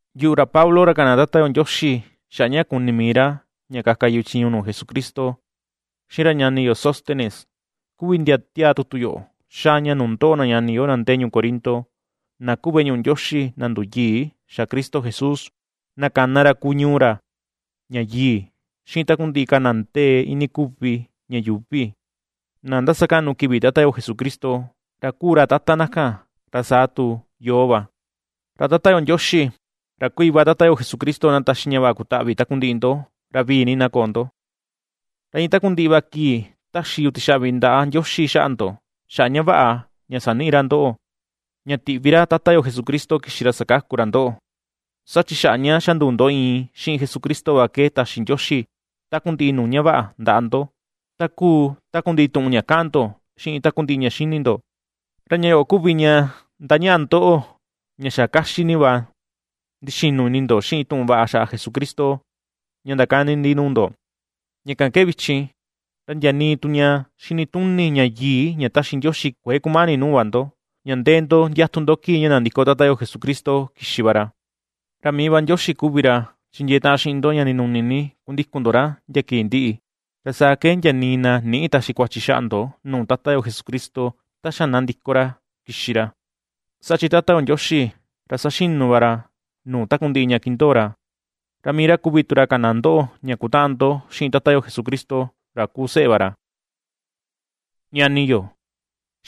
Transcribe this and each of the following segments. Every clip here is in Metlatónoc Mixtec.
Yuꞌu, ra Pablo, ra kana Tata yo Ndioxi xaꞌa ña kuni mii ra ña kaka yu chiñu nuu Jesucristo, xiꞌin ra ñani yo Sóstenes, kuvi ndi ^tiáá tutu yoꞌo xáá ña nuu ndoꞌo na ñani yo, na ndee ñuu Corinto, na kúu veꞌe ñuꞌu Ndioxi na nduyii xa̱ Cristo Jesús, na kana ra kuu ñuu ra ña yii, xiꞌin takundiꞌi ka na ndee iinii kuvi ña yuuvi na ndasakaꞌnu kivi Tata yo Jesucristo, ra kuu ra Tata na kan, ra saa tu yoo va. Ra Tata yo Ndioxi, ra kuu Iva Tata yo Jesucristo na taxi ña vaꞌa kutaꞌvi takundiꞌi ndo, ra vivii na koo ndo. Ra iin takundiꞌi va kii ^taxi yu tixaꞌvi ndaꞌa Ndioxi xaꞌa ndo, xaꞌa ña vaꞌa ña saniꞌi ra ndoꞌo, ña tiꞌvi ra Tata yo Jesucristo kixi ra sakaku ra ndoꞌo. Saa chi xaꞌa ña xa nduu ndo iin xiꞌin Jesucristo va ke taxi Ndioxi takundiꞌi nuu ña vaꞌa ndaꞌa ndo, ta kuu takundiꞌi tuꞌun ña kaꞌan ndo, xiꞌin takundiꞌi ña xini ndo. Ra ña yoꞌo kuvi ña ndañaꞌa ndoꞌo ña xa kaxi ni va ndixinu ini ndo xiꞌin tuꞌun vaꞌa xaꞌa Jesucristo ña ndakani ndi nuu ndo. Ña kan ke vichin, ra ndia nii tu ña xinituni ña yii ña ^ta̱xi Ndioxi kuëe kumani nuu va ndo, ña ndee ndo ndiatu ndo kii ña nandiko Tata yo Jesucristo kixi va ra. Ra mii Ndioxi va kuvi ra chindiee taꞌan xiꞌin ndo ña ndinuni ni kundikun ndo ra ndia kii ndiꞌi, ra saa ke ndia nii na nïꞌi taxi kuachi xaꞌa ndo nuu Tata yo Jesucristo ta xa na ndiko ra kixi ra. Saa chi Tata yo Ndioxi ra saxinu va ra nuu takundiꞌi ña kindoo ra, ra mii ra kuvi tu ra kana ndoꞌo ña kutaꞌan ndo xiꞌin Tata yo Jesucristo ra kuu seꞌe va ra. Ñani yo,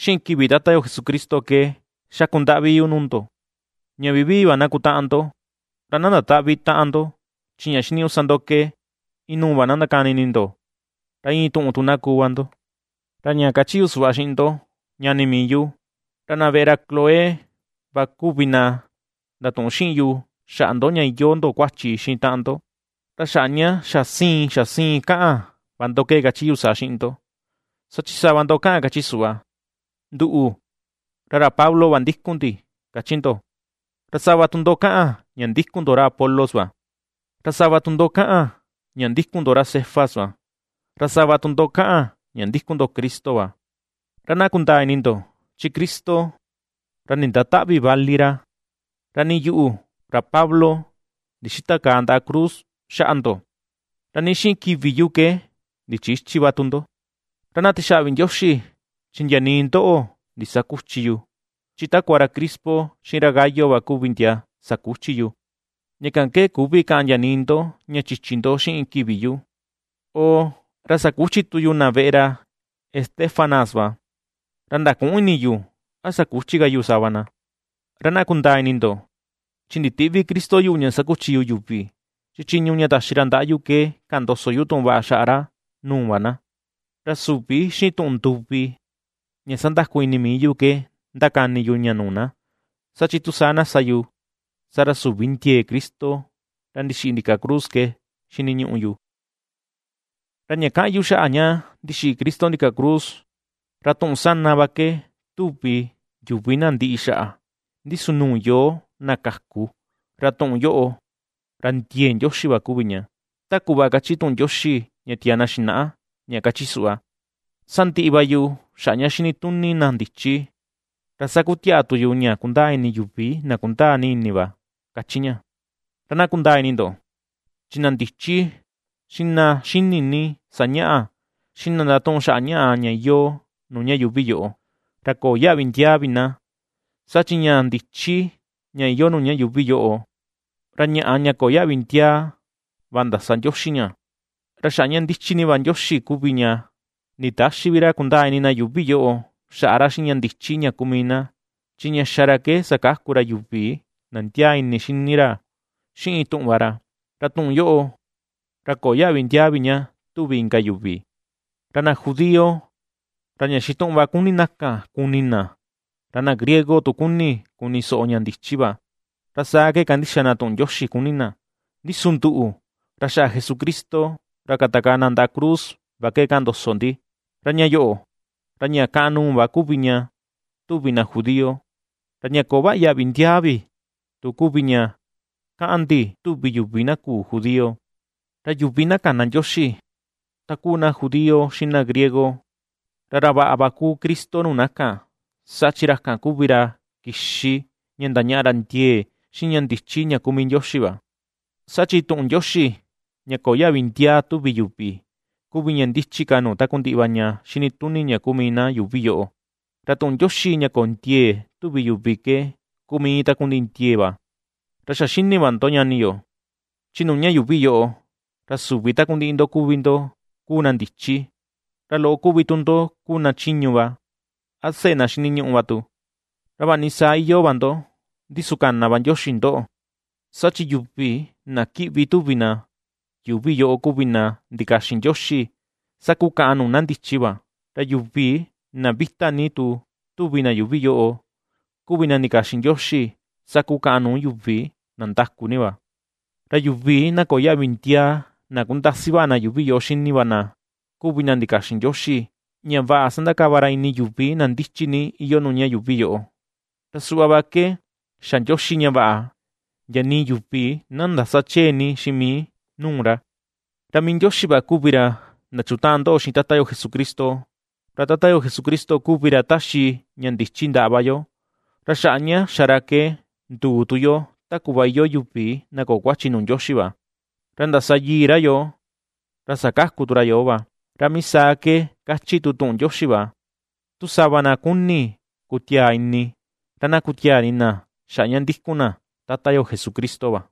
xiꞌin kivi Tata yo Jesucristo ke ^xakundaꞌvi yu nuu ndo, ña vivii va na kutaꞌan ndo, ra na ndatäꞌvi taꞌan ndo, chi ña xiniñuꞌu sa ndo ke inuu va na ndakani ini ndo, ra iin tuꞌun tu na kuu va ndo. Ra ña kachi yu suꞌva xiꞌin ndo, ñani mii yu, ra na veꞌe ra Cloé va kuvi na ndatuꞌun xiꞌin yu xaꞌa ndo ña iyoo ndo kuachi xiꞌin taꞌan ndo. Ra xaꞌa ña xa siin, xa siin kaꞌan va ndo ke kachi yu saa xiꞌin ndo, saa chi sava ndo kaꞌan, kachi suꞌva: “Nduꞌu, ra ra Pablo va ndikun ndi”, kachi ndo. Ra sava tu ndo kaꞌan ña ndikun ndo ra Apolos va; ra sava tu ndo kaꞌan ña ndikun ndo ra Cefas va; ra sava tu ndo kaꞌan ña ndikun ndo Cristo va. Ra na kundaa ini ndo, chi Cristo ra nindatäꞌvi vali ra. Ra nii yuꞌu, ra Pablo, ndixïtakaa ndaꞌa cruz xaꞌa ndo. Ra nii xiꞌin kivi yu ke ndichïchi va tu ndo. Ra na tixaꞌvi Ndioxi, chi ndia nii ndoꞌo ndisaküchi yu, chi takua ra Crispo, xiꞌin ra Gayo va kuvi ndia sakuchi yu. Ña kan ke küvi kaꞌan ndia nii ndo ña chichi ndo xiꞌin kivi yu. Oo, ra sakuchi tu yu na veꞌe ra Estéfanas va, ra ndaküꞌun ini yu, a sakuchi ka yu sava na. Ra na kundaa ini ndo, chi nditïꞌvi Cristo yuꞌu ña sakuchi yu yuvi, chi chiñu ña taxi ra ndaꞌa yu ke kaꞌan ndoso yu tuꞌun vaꞌa xaꞌa ra nuu va na; ra süvi xiꞌin tuꞌun nduvi ña sandaku ini mii yu ke ^ndakani yu ña nuu na, saa chi tu saa na sa yu, saa ra, süvi vi ndiee Cristo ra ndixiꞌi ndika cruz ke xiniñuꞌu yu. Ra ña kaꞌan yu xaꞌa ña ndixiꞌi Cristo ndika cruz, ra tuꞌun sana va ke tuvi yuvi na ndiꞌi xaꞌa; ndi su nuu yoo, na kaku, ra tuꞌun yoꞌo, ra ndiee Ndioxi va kuvi ña. Ta kuꞌva káchí tuꞌun Ndioxi ña tiaa na xinaꞌa, ña kachi suꞌva: Sandiꞌi va yu xaꞌa ña xini tuni na ndichi, ra sakutiaꞌa tu yu ña kundaa ini yuvi na kundaa ni ini va, ^kachi ña. Ra na kundaa ini ndo, chi na ndichi xiꞌin na xini ni sañaꞌa, xiꞌin na ndatuꞌun xaꞌa ñaꞌa ña iyoo nuu ña yuuvi yoꞌo, ra köo yaꞌvi ndiaa vi na. Saa chi ña ndichi ña iyoo nuu ña yuuvi yoꞌo, ra ñaꞌa ña köo yaꞌvi ndiaa va ndasa Ndioxi ña. Ra xaꞌa ña ndichi ni va Ndioxi kuvi ña nditäxi vi ra kundaa ini na yuuvi yoꞌo xaꞌa ra xiꞌin ña ndichi ña kuu mii na; chi ña xa ra ke sakaku ra yuvi na ndiaa ini xini ra xiꞌin tuꞌun va ra, ra tuꞌun yoꞌo, ra köo yaꞌvi ndiaa vi ña tuvi inka yuvi. Ra na judío, ra ña xituꞌun va ^kuni na kan kuni na, ra na griego tu, ^kuni kuni soꞌo ña ndichi va; ra saa ke kandixa na tuꞌun Ndioxi kuni na. Ndi su nduꞌu, ra xaꞌa Jesucristo ra katakaa na ndaꞌa cruz va ke ^kaꞌan ndoso ndi. Ra ña yoꞌo, ra ña kàꞌàn nuu va kuvi ña tuvi na judío, ra ña köo vaꞌa yaꞌvi ndiaa vi tu kuvi ña kaꞌan ndi tuvi yuvi na küu judío; ra yuvi na kana Ndioxi, ta kuu na judío, xiꞌin na griego, ra ra vaꞌa va kuu Cristo nuu na kan, saa chi ra kan kuvi ra kixi ña ndañaꞌa ra ndiee, xiꞌin ña ndichi ña kuu mii Ndioxi va. Saa chi tuꞌun Ndioxi ña köo yaꞌvi ndiaa tuvi yuvi, kuvi ña ndichi ka nuu takundiꞌi va ña xinituni ña kuu mii na yuuvi yoꞌo; ra tuꞌun Ndioxi ña köo ndiee tuvi yuvi ke, kuu mii iin takundiꞌi ndiee va. Ra xa xini va ndo, ñani yo, chi nuu ña yuuvi yoꞌo, ra süvi takundiꞌi ndo kuvi ndo kuu na ndichi, ra loꞌo kuvi tu ndo kuu na chiñu va, a seꞌe na xiniñuꞌu va tu. Ra vaꞌa ni saa iyoo va ndo, ndi su kana va Ndioxi ndoꞌo. Saa chi yuvi na kiꞌvi, tuvi na, yuuvi yoꞌo kuvi na ndikaxin Ndioxi, sakukaꞌan nuu na ndichi va; ra yuvi na vita ni tu tuvi na yuuvi yoꞌo, kuvi na ndikaxin Ndioxi, sakukaꞌan nuu yuvi na ndaku ni va. Ra yuvi na köo yaꞌvi ndiaa, na kundasi vaꞌa na yuuvi yoꞌo xini va na, kuvi na ndikaxin Ndioxi ña vaꞌa sandakava ra ini yuvi na ndichi ni iyoo nuu ña yuuvi yoꞌo. Ra suꞌva va ke xa Ndioxi ña vaꞌa ndia nii yuvi na ndäsa chee ni xiꞌin mii nuu ra. Ra mii Ndioxi va kuvi ra ndachutaꞌan ndoꞌo xiꞌin Tata yo Jesucristo; ra Tata yo Jesucristo kuvi ra ^taxi ña ndichi ndaꞌa va yo, ra xaꞌa ña xa ra ke nduu tu yo ta kuꞌva iyoo yuvi na köo kuachi nuu Ndioxi va, ra ndasa yii ra yoo, ra sakaku tu ra yoo va. Ra mii saa ke kachi tu tuꞌun Ndioxi va: “Tu sava na kuni kutiaa ini, ra na kutiaa ini na xaꞌa ña ndikun na Tata yo Jesucristo va.”